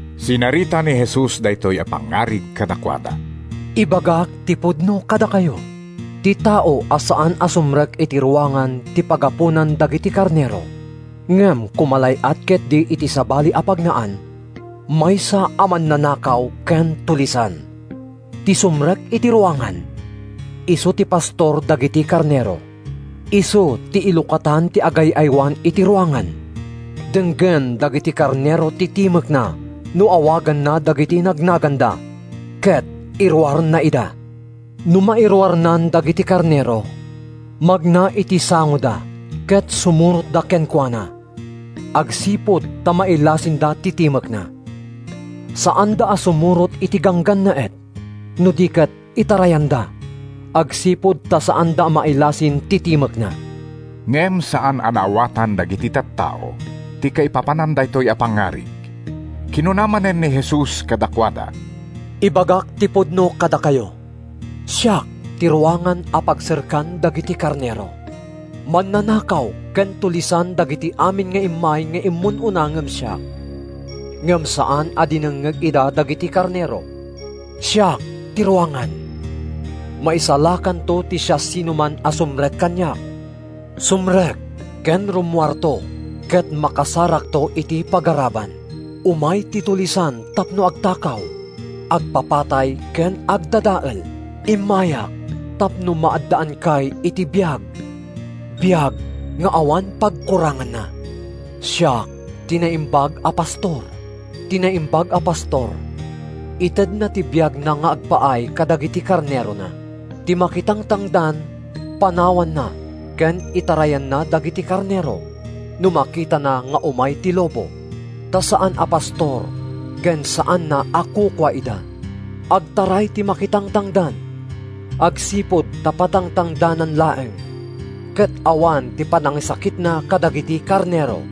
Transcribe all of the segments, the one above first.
Sinarita ni Jesus daytoy a pangngarig kadakuada: “Ibagak ti pudno kadakayo: Ti tao a saan a sumrek iti ruangan ti pagaponan dagiti karnero, ngem kumalay-at ketdi iti sabali a pagnaan, maysa a mannanakaw ken tulisan. Ti sumrek iti ruangan, isu ti pastor dagiti karnero. Isu ti ilukatan ti agay-aywan iti ruangan. Denggen dagiti karnero ti timekna no awaganna dagiti nagnaganda, ket iruarna ida. No mairuarnan dagiti karnero, magna iti sangoda ket sumurotda kenkuana, agsipud ta mailasinda ti timekna. Saanda a sumurot iti ganggannaet no di ket itarayanda, agsipud ta saanda a mailasin ti timekna.” Ngem saan a naawatan dagiti tattao ti kaipapanan daytoy a pangngarig. Kinuna manen ni Jesus kadakuada, “Ibagak ti pudno kadakayo: Siak ti ruangan a pagserkan dagiti karnero. Mannanakaw ken tulisan dagiti amin nga immay nga immun-una ngem siak, ngem saan a dinengngeg ida dagiti karnero. “Siak ti ruangan. Maisalakanto ti siasinoman a sumrek kaniak; sumrek ken rummuarto ket makasarakto iti pagaraban. Umay ti tulisan tapno agtakaw, agpapatay ken agdadael. Immayak tapno maaddaankay iti biag—biag nga awan pagkuranganna. “Siak ti naimbag a pastor. Ti naimbag a pastor itedna ti biagna nga agpaay kadagiti karnerona. Ti makitangtangdan panawan ken itarayanna dagiti karnero no makitana nga umay ti lobo, ta saan a pastor ken saanna a kukua ida. Agtaray ti makitangtangdan agsipud ta patangtangdanan laeng ket awan ti panangisakitna kadagiti karnero.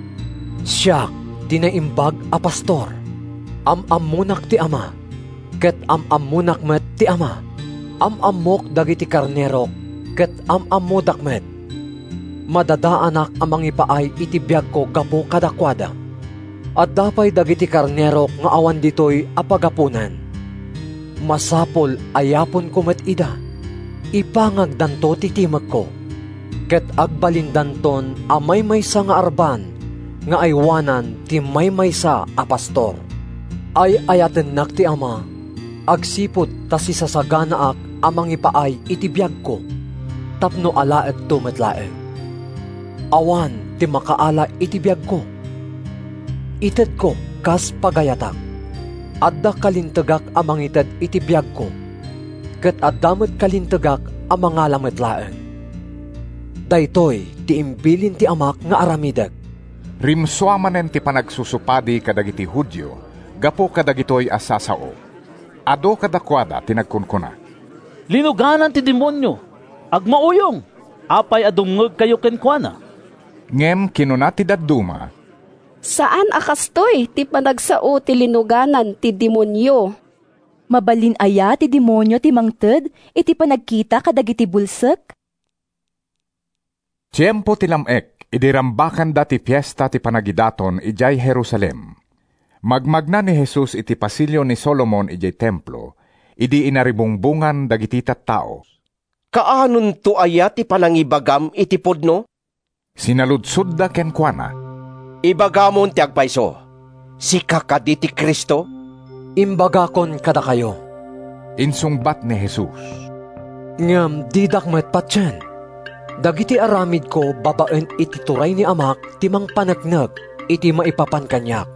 “Siak ti naimbag a pastor. Am-ammonak ti Ama, ket am-ammok met ti Ama. Am-ammok dagiti karnerok ket am-ammodak met. Madadaanak a mangipaay iti biagko gapu kadakuada. Adda pay dagiti karnerok nga awan ditoy a pagaponan. Masapul nga yaponko met ida. Ipangagdanto ti timekko, ket agbalindanton a maymaysa nga arban nga aywanan ti maymaysa a pastor. “Ay-ayatennak ti Ama agsipud ta sisasaganaak a mangipaay iti biagko, tapno alaekto met laeng. Awan ti makaala iti biagko. Itedko kas pagayatak. Adda kalintegak a mangited iti biagko, ket adda met kalintegak a mangala met laeng. Daytoy ti imbilin ti Amak nga aramidek.” Rimsua manen ti panagsusupadi kadagiti Judio gapu kadagitoy a sasao. Adu kadakuada ti nagkunkuna, “Linuganan ti demonio. Agmauyong! Apay a dumngegkayo kenkuana?” Ngem kinuna ti dadduma, “Saan a kastoy ti panagsao ti linuganan ti demonio! Mabalin aya ti demonio ti mangted iti panagkita kadagiti bulsek?” Tiempo ti lam-ek idi rambakanda ti Fiesta ti Panagidaton idiay Jerusalem. Magmagna ni Jesus iti Pasilio ni Solomon idiay Templo idi inaribungbongan dagiti tattao. “Kaanonto aya ti panangibagam iti pudno?” sinaludsodda kenkuana. “Ibagamon ti agpayso! Sika kadi ti Cristo?” “Imbagakon kadakayo,” insungbat ni Jesus, “ngem didak met patien. Dagiti aramidko babaen iti turay ni Amak ti mangpaneknek iti maipapan kaniak.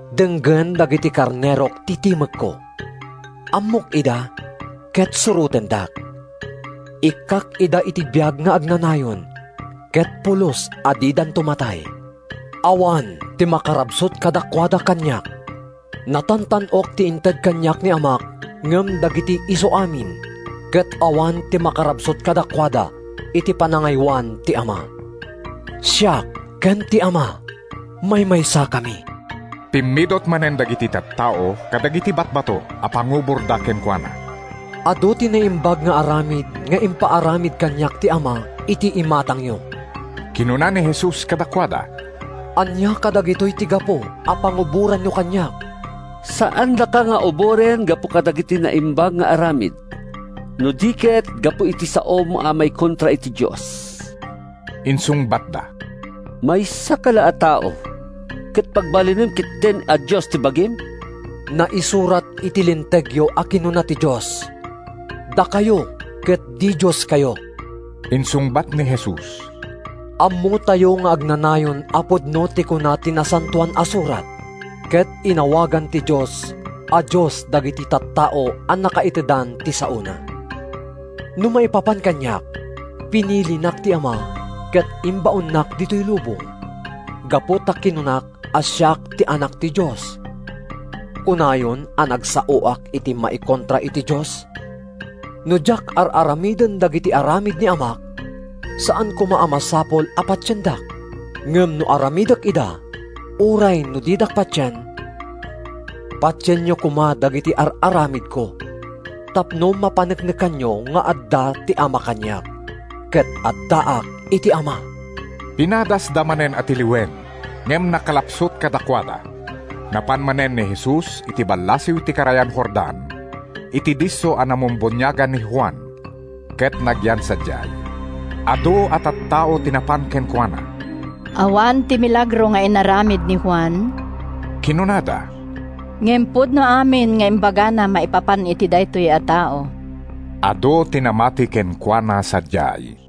Denggen dagiti karnerok ti timekko. Ammok ida, ket surotendak. Ikkak ida iti biag nga agnanayon, ket pulos a didanto matay. Awan ti makarabsut kadakuada kaniak. Natantan-ok ti inted kaniak ni Amak ngem dagiti isuamin, ket awan ti makarabsut kadakuada iti panangaywan ti Ama. Siak ken ti Ama, maymaysakami.” Pimmidut manen dagiti tattao kadagiti batbato a panguborda kenkuana. “Adu ti naimbag nga aramid nga impaaramid kaniak ti Ama iti imatangyo,” kinuna ni Jesus kadakuada. “Ania kadagitoy ti gapu a panguboranyo kaniak?” “Saandaka nga uboren gapu kadagiti naimbag nga aramid, no di ket gapu iti saom a maikontra iti Dios,” insungbatda. “Maysaka la a tao, ket pagbalinem ketdin a Dios ta bagim!” “Naisurat iti Lintegyo a kinuna ti Dios: ‘Dakayo ket didioskayo!’” insungbat ni Jesus. “Ammotayo nga agnanayon a pudno ti kuna ti Nasantoan a Surat, ket inawagan ti Dios a dios dagiti tattao a nakaitedan ti saona. No maipapan kaniak, pinilinak ti Ama ket imbaonnak ditoy lubong. Gapu ta kinunak a siak ti Anak ti Dios, kunayon a nagsaoak iti maikontra iti Dios? No diak ar-aramiden dagiti aramid ni Amak, saan koma a masapul a patiendak. Ngem no aramidek ida, uray no didak patien, patienyo koma dagiti ar-aramidko tapno mapaneknekanyo nga adda ti Ama kaniak, ket addaak iti Ama.” Pinadasda manen a tiliwen ngem nakalapsut kadakuada. Napan manen ni Jesus iti ballasiw ti karayan Jordan, iti disso a namumbuniagan ni Juan ket nagyan sadiay. Adu a tattao ti napan kenkuana. “Awan ti milagro nga inaramid ni Juan,” kinunada, “ngem pudno amin nga imbagana maipapan iti daytoy a tao.” Adu ti namati kenkuana sadiay.